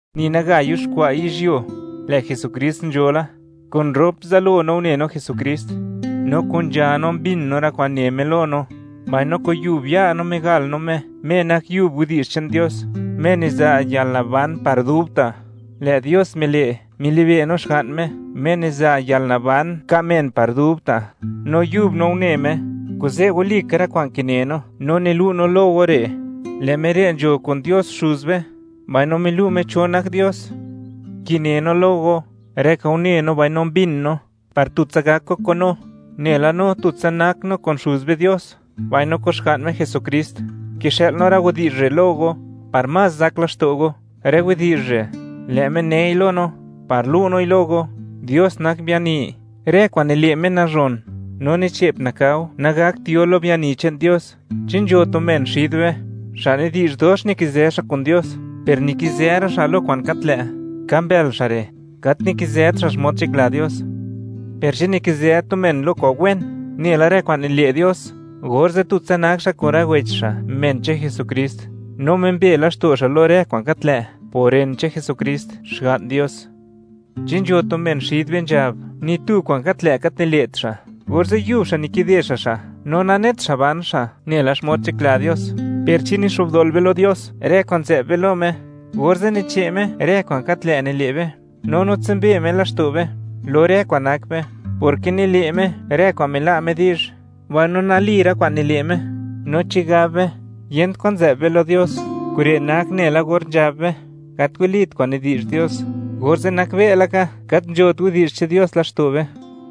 Ni naga yuxkwa' yizhyuo, lë' Jesukrist nzho la. Kun rop zalo no une no Jesukrist, no kun nzha no mbin no rë kwa'n ne Me lo no, mbaino kun yub ya' no migal no Me, Me nak yub widi'zh che'n Dios, Me niza' yalnaban par dubta'. Lë' Dios mile', milibe' no, Xga'n Me, Me niza' yalnaban ka' men par dubta'; no yub no une Me. Kuze' walika rë kwa'n kine no, no nilu' no lo go re', lë' Me re' nzho kun Dios Xuz be, mbaino milu' Me cho nak Dios. Kine no lo go rë kwa'n une no mbin no par tutsa gak go kun no, nela no tutsa nak no kun Xuz be Dios mbaino kun Xga'n Me Jesukrist. Kixë'l no rë widi'zh re' lo go par más zak laxto' go. Rë widi'zh re', lë' Me nei lo no par lu' noi lo go: Dios nak biani; rë kwa'n nile' Me, nazhon, no ni che'p nakao nagakt yo lo biani che'n Dios. Chi nzho tu men xid be xa' nidi'zh, dox nikizë xa' kun Dios, per nikizë ra' xa' lo kwa'n gat lë', ka mbël xa' re', gat nikizët xa' xmod nzhakla Dios. Per chi nikizë tu men lo kwa'n wen, nela rë kwa'n nile' Dios, orze' tutsa nak xa' kun rë wech xa', men che'n Jesukrist, no mimbe laxto' xa' lo rë kwa'n gat lë' por ren che'n Jesukrist, Xga'n Dios. Chi nzho tu men xid be nzhab, ni tu kwa'n gat lë' gat nile't xa', orze' yub xa' re' nikide xa' xa', no nanet xa' ban xa' nela xmod nzhakla Dios; per chi nixo'bdol be lo Dios rë kwa'n nzë'b be lo Me, orze' niche' Me rë kwa'n gat lë' nile' be, no nitsumbe Me laxto' be lo rë kwa'n nak be; porke nile' Me rë kwa'n mila' Me di'zh, mbaino nali rë kwa'n nile' Me. No chi gab be, yent kwan nzë'b be lo Dios, kure' nak nela or nzhab be, gat walit kwa'n nidi'zh Dios, orze' nakbe' laka, gat nzhot widi'zh che'n Dios laxto' be.